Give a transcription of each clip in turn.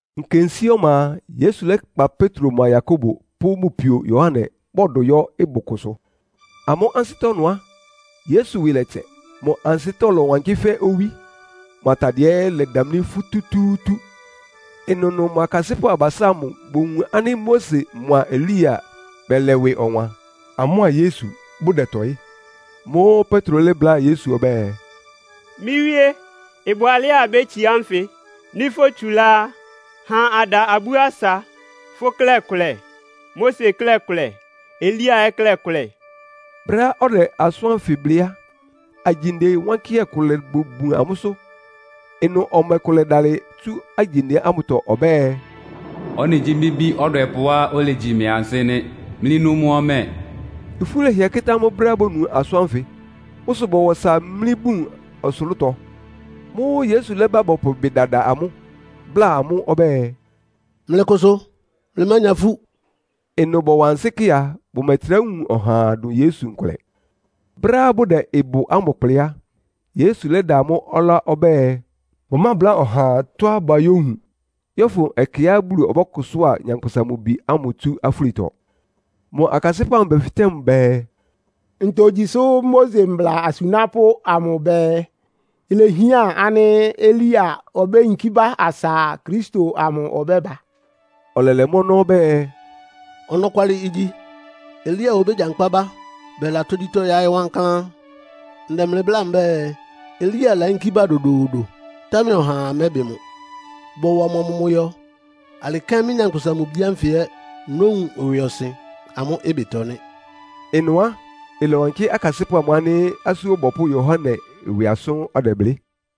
Nkensíé ɔma a, Yesu lɛ́kpa Petro mʋa Yakobo pʋ́ mʋ pio Yohane, bɔdʋ yɔ́ ɩbʋ kʋsʋ. Amʋ́ ansɩ́tɔ́ ɩnʋ á, Yesu ɩwɩ lɛtsɛ. Mʋ ansɩ́tɔ́ lɔ́wankɩ́ fɛ́ owí, mʋ atadɩɛ ɛ́ lɛdamlí fútútúútú. Ɩnʋnʋ mʋ akasɩ́pʋ́ abasá ámʋ bowun ánɩ́ Mose mʋa Elia bɛlɛ ɩwɩ ɔwan, amʋ́a Yesu bʋdɛtɔɩ́. Mʋ́ʋ́ Petro lɛ́bláa Yesu ɔbɛ́ɛ, “Mɩ́ Wíé, ɩbʋ alɛ́á abétsiá nfɩ. Nɩ́ fótsulá á, ha ada abú asa. Fʋ́ klɛ́ kʋlɛ, Mose klɛ́ kʋlɛ, Elia ɛ́ klɛ́ kʋlɛ.” Brɛ́á ɔdɛ asʋ́n ánfɩ blɩ́ á, agyinde wánkɩ́hɛ́ kʋ lobobun amʋ́sʋ́. Ɩnʋ ɔmɛ kʋ lɛdalɩ tsu agyinde ámʋtɔ ɔbɛ́ɛ, “Ɔ́nɩ gyí mɩ́ Bí ɔdwɛpʋ́á olegyi mɩ ansɩ́ nɩ́. Mlɩnu mʋ ɔmɛ.” Ifú lɛhɩɛ kɩ́tá amʋ́ brɛ́á bonu asʋ́n ánfɩ. Mʋ́ sʋ bɔwa ɔsa mlí bun ɔsʋlʋ́tɔ. Mʋ́ʋ́ Yesu lɛ́ba bɔpʋ ɩbɩ dada amʋ́, bláa amʋ́ ɔbɛ́ɛ, “Mlɩkʋsʋ, mlɩmánya ifú.” Ɩnʋ bɔwa ansɩ́ kɩ a, bʋmɛtrá wun ɔhaa dʋn Yesu nkʋlɛ. Brɛ́á bʋdɛ ɩbʋ ámʋ kplɩ́ á, Yesu lɛ́da amʋ́ ɔlá ɔbɛ́ɛ, bʋmábláa ɔhaa tɔ́á bayówun, yɔ́fʋn ɛkɛá Bulu ɔbɔ́kʋsʋ́a Nyankpʋsa-Mʋ-Bi ámʋ tsú afúlitɔ. Mʋ akasɩ́pʋ́ amʋ bɛfɩtɛ́ mʋ bɛɛ, “Ntogyi sʋ́ Mose mbla asunápʋ́ amʋ bɛɛ, ilehián ánɩ́ Elia obéyinkí bá asa Kristo amʋ ɔbɛ́ba?” Ɔlɛlɛ mʋ́ ɔnɔ́ ɔbɛ́ɛ, “Ɔnɔkwalɩ igyi. Elia obégyankpá bá bɛla tógyítɔ́ yáɩ́ wankláán. Ndɛ mlɩ bláa mbɛ́ɛ, Elia layínkí bá dodoodo, támɛ ɔhaa mɛ́bɩ mʋ. Bɔwa mʋ amʋmʋyɔ. Alɩ kɛ́n mɩ́, Nyankpʋsa-Mʋ-Bi ánfɩ ɛ́ nówun ɩwɩɔsɩn amʋ́ ɩbɩtɔ nɩ́.” Ɩnʋ á, ɩlɔwankɩ́ akasɩ́pʋ́ amʋ ánɩ́ Asú Ɔbɔpʋ́ Yohane ɩwɩ asʋ́n ɔdɛblɩ́.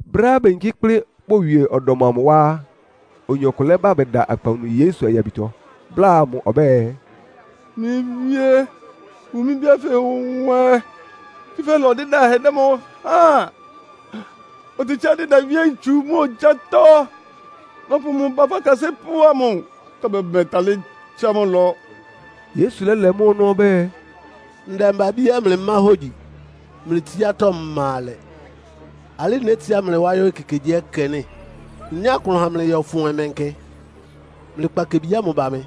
Brɛ́á beyinkí kplɩ́ bowie ɔdɔm amʋ wá á, oyin ɔkʋ lɛ́ba bɛda akpawunu Yesu ayabitɔ, bláa mʋ ɔbɛ́ɛ, “Mɩ́ Wíé, wun mɩ́ bí ánfɩ nwɛ, tsúfɛ́ ɩlɔ dɩ́dahɛ dɛ mʋ háan. Otetsíá dɩda wíé ntsu mʋ́a ogyátɔ́. Nɔpʋ mʋ ba fʋ́ akasɩ́pʋ́ amʋ, támɛ bʋmɛtalɩ́ tsá mʋ ɩlɔ.” Yesu lɛ́lɛ mʋ́ ɔnɔ́ ɔbɛ́ɛ, “Ndɛmba-abíá mlɩmá hógyi, mlɩ tsiátɔ́ ma alɛ. Alɩ́ nétsiá mlɩ wá yɔ́ ekekegyíɛkɛ nɩ́? Nnyá klʋn ha mlɩ yɔ́fʋn ɔmɛnkɛ? Mlɩkpa kebi ámʋ ba mɩ!”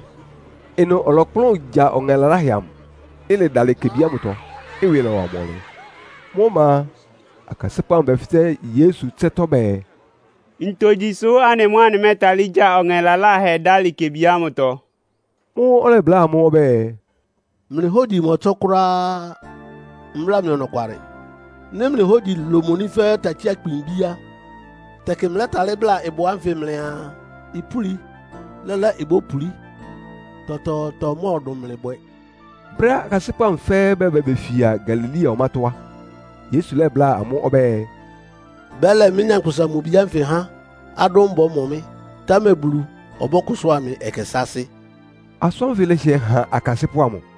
Ɩnʋ ɔlɔkplʋ́n gya ɔŋɛ laláhɛ amʋ. Ɩlɛdalɩ kebi ámʋtɔ, ɩwɩ lɔ́wa mʋ ɔnlɩn. Mʋ́ ɔma a, akasɩ́pʋ́ amʋ bɛfɩtɛ́ Yesu ɩtsɛ́tɔ́ bɛɛ, “Ntogyi sʋ́ anɩ mʋ́ anɩmɛ́talɩ́ gya ɔŋɛ laláhɛ amʋ dálɩ kebi ámʋtɔ?” Mʋ́ʋ́ ɔlɛbláa amʋ́ ɔbɛ́ɛ, “Mlɩ hógyi mɔtsɔ́ kʋ́ráá. Mbláa mlɩ ɔnɔkwalɩ. Nɩ́ mlɩ hógyi lomoní fɛ́ takyí-akpin ibí á, tɛkɩ mlɛ́talɩ́ bláa ɩbʋ ánfɩ mlɩaa ipúli. Lɛ́lɛ́ ibópulí, tɔtɔɔtɔ mɔ́ɔdʋn mlɩ bwɛ.” Brɛ́á akasɩ́pʋ́ amʋ fɛ́ɛ́ bɛba befia Galilea ɔmátɔ́ á, Yesu lɛ́bláa amʋ́ ɔbɛ́ɛ, “Bɛ́lɛ mɩ́, Nyankpʋsa-Mʋ-Bi ánfɩ há adʋ́n bɔ́mɔ mɩ́, támɛ Bulu ɔbɔ́kʋsʋ́a mɩ ɛkɛ sáásɩ́.” Asʋ́n ánfɩ lɛhɩɛ han akasɩ́pʋ́ amʋ.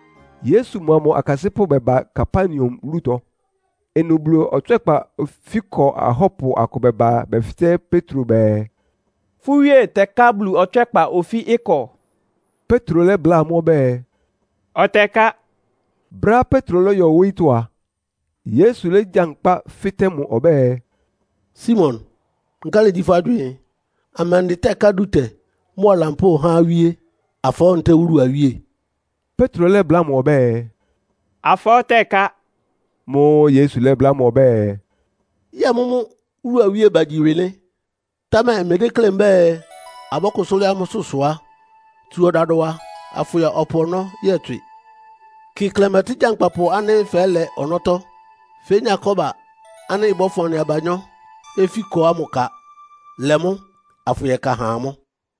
Yesu mʋa mʋ akasɩ́pʋ́ bɛba Kapernaum wúlutɔ. Ɩnʋ Bulu ɔtswɛ́kpa ofíkɔ ahɔ́pʋ akʋ bɛba bɛfɩtɛ́ Petro bɛɛ, “Fʋ́ wíe tɛká Bulu ɔtswɛ́kpa ofí ɩkɔ?” Petro lɛ́bláa amʋ́ ɔbɛ́ɛ, “Ɔtɛká.” Brɛ́á Petro lɔ́yɔ wóyítɔ́ a, Yesu légyankpá fɩ́tɛ́ mʋ ɔbɛ́ɛ, “Simon, nkálɩ gyí fʋ́ agywɩɩn? Amɛndɩ tɛ́ká dútɛ mʋ́a lampóo há awíe? Afɔɔ́ ntɛ́ɛ wúlu awíe?” Petro lɛ́bláa mʋ ɔbɛ́ɛ, “Afɔɔ́ tɛká.” Mʋ́ʋ́ Yesu lɛ́bláa mʋ ɔbɛ́ɛ, “Yɛ́ɛ mʋ́mʋ́ wúlu awíe bagyi ɩwɩ nɩ́? Támɛ mmedéklé mbɛ́ɛ, abɔ́kʋsʋ́ lɩ́ɩ́ amʋ́sʋ́ sʋ á, tsu ɔdadʋwa afʋyɔ ɔpʋ ɔnɔ́ yɔtswɩ. Kɩ klɛmɛtɩ́ gyankpapʋ ánɩ́ fɛ́lɛ ɔnɔ́tɔ́. Fénya kɔ́ba ánɩ́ ɩbɔ́fʋn anɩ abanyɔ́ ofíkɔ ámʋ ka. Lɛ mʋ́, afʋyɛka ha amʋ́.”